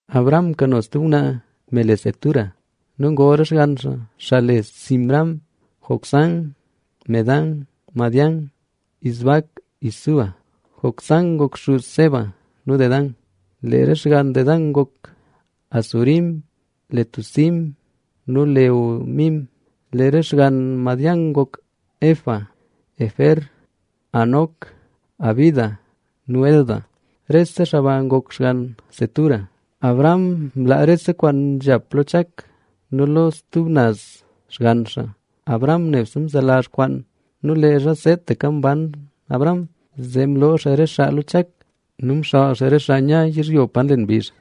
Abraham mkano stub ngwnaa me le Cetura. Nu ngol re xgann xaa, xaa le: Zimram, Jocsán, Medán, Madián, Isbac nu Súa. Jocsán ngok xuz Seba nu Dedán. Lee re xgann Dedán ngok Asurim, Letusim nu Leumim. Lee re xgann Madián ngok: Efa, Efer, Hanoc, Abida nu Elda. Rese xaa ba ngok xgann Cetura. Abraham mlaa rese kwaan nzhap lo Chak. Nu lo re stub naz xgann xaa, Abraham nebse mzelazh kwaan nu leezha seetaka mban Abraham, zee mloo xaa re xaa lo Chak nu mxaal xaa re xaa nya yizhyo pa nlen mbizh.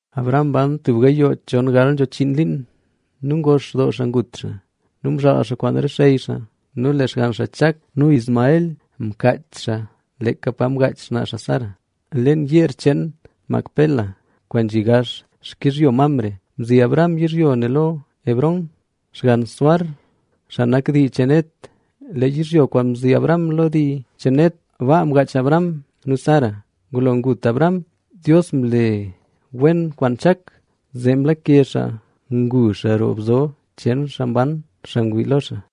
Abraham mban tub gayoo chon gal nzho chiin liin. Nu ngox doo xaa ngut xaa nu mzhaal xaa kwaan re xey xaa. Nu lee xgann xaa Chak nu Ismael mkaach xaa leeka pa mgaach sa xaa Sara, leen yeer cheen Macpela, kwaan nzhi gax xkizhyo Mamre. Mzi Abraham yizhyo ne lo Efrón, xgann Zohar, xaa nak dii cheen Het. Lee yizhyo kwaan mzi Abraham lo dii cheen Het, baa mgaach Abraham nu Sara. Ngulo ngut Abraham, Dios mle wen kwaan Chak, zee mlake xaa ngu xaa roo Bzo cheen Xaa Mban, xaa ngwii lo xaa.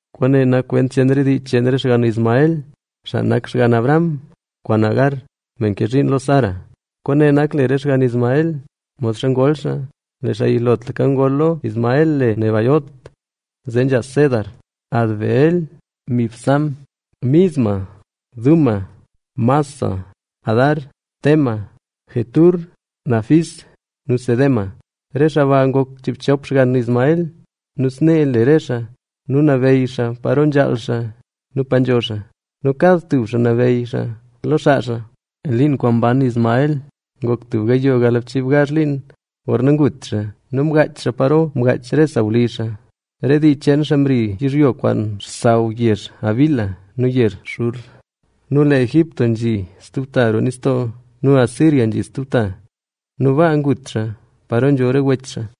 Kwaane nak kwent cheen re dii cheen re xgann Ismael, xaa nak xgann Abraham kwaan Agar, me mke zhiin lo Sara. Kwaane nak le re xgann Ismael, modxa ngol xaa. Lee xaa yilotlaka ngol lo Ismael le Nebaiot, zee nzha Cedar, Adbeel, Mibsam, Misma, Duma, Massa, Hadar, Tema, Jetur, Nafis nu Cedema. Re xaa ba ngok chiibchop xgann Ismael nu snee le re xaa. Nu nabeyy xaa paro nzhaal xaa nu pa nzho xaa. Nu kad tub xaa nabeyy xaa lo xaa xaa. Liin kwaan mban Ismael ngok tub gayoo galbchii gazh liin gorna ngut xaa; nu mgaach xaa paro mgaach re sawlizh xaa. Re dii cheen xaa mri yizhyo kwaan xsaw yezh Havila nu yezh Shur; nu lee Egipto nzhi stub ta roo nistoo nu Asiria nzhi stub ta. Nu baa ngut xaa paro nzho re wech xaa.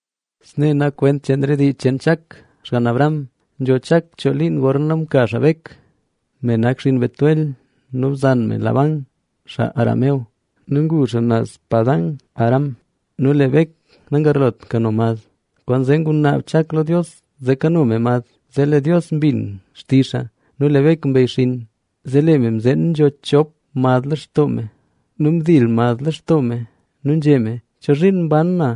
Snee nak kwent cheen re dii cheen Chak xgann Abraham. Nzho Chak choo liin gorna mka xaa Bek, me nak xinn Betuel nu bzan Labán, xaa Aram nu ngu xaa naz Padan-aram. Nu lee Bek nagarlot kano mad, kwaanzee ngunaab Chak lo Dios zee kano me mad; zee lee Dios mbin xtizh xaa nu lee Bek mbeyxinn. Zee lee me mzeen nzho chop mad lextoo me nu ndil mad lextoo me. Nu nzhé me. “¿Chozhiin mban na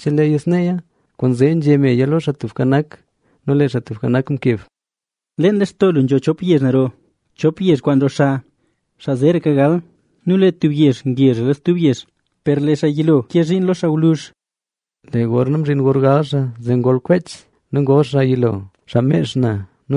cheleeya sneeya?” Kwaanzee nzhé meya lo Xaa Tubka Nak. Nu lee Xaa Tubka Nak mkeb: Leen lextoo lu nzho chop yezh naro, chop yezh kwaan roxa, xaa zeeraka gal nu lee tub yezh ngezhra lo stub yezh, per lee xaa yilo ke zhiin lo xaa gwluzh. Lee gorna mzhin gor gal xaa, zee ngol kwech xaa. Nu ngol xaa yilo, xaa mex na;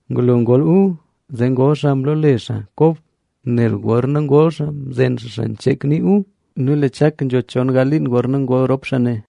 Ngulo ngol Esaú, zee ngol xaa mloole xaa Kob,b nel gorna ngol xaa mzen xaa xancheeck nii Esaú. Nu lee Chak nzho chon gal liin gorna ngol rop xaa ne.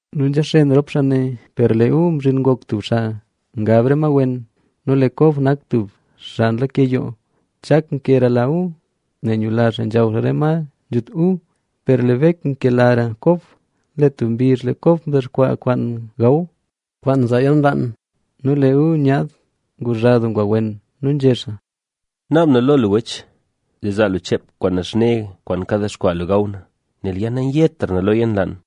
Nu nzhaxen rop xaa ne. Lee Esaú mzhin ngok tub xaa nya lo re ma wen nu lee Kob nak tub xaa nlake yoo. Chak nkerala Esaú, nel nyula xaa nzhaw xaa re ma nzhut Esaú, per lee Bek nkelara Kob. Lee tub mbizh lee Kob mdexkwaa kwaan gaw. Nu lee Esaú nyaad nguzha doo ngwa wen. Nu nzhé xaa: —Naab na lo lu, wech, zee zaa lu cheep kwaan naxne kwaan kadexkwaa lu gaw na, nel ya na nayetra na lo yalnlaan.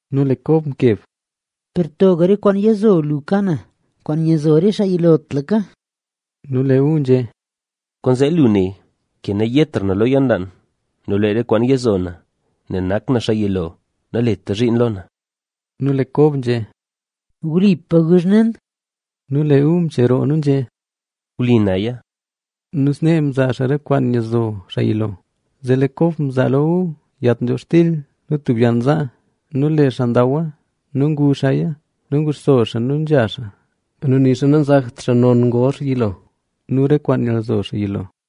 Nu lee Kob mkeb: —Per toga re kwaan yizo lu ka na, kwaan nyizo re xaa yilotlaka. Nu lee Esaú nzhé: —Kwaanzee lu ne ke nayetra na lo yalnlaan. Nu lee re kwaan yizo na, nel nak na xaa yilo naleta zhiin lo na. Nu lee Kob nzhé: —Wlipa guzh nen. Nu lee Esaú mcheroo nu nzhé: —Wli naya. Nu snee mzaa xaa re kwaan nyizo xaa yilo. Zee lee Kob mzaa lo Esaú yat nzhobxtil nu tub yann zaa. Nu lee xaa ndawa nu ngu xaaya nu nguxso xaa nu nzha xaa. Nu nixa nanzakt xaa non ngol xaa yilo nu re kwaan nyizo xaa yilo.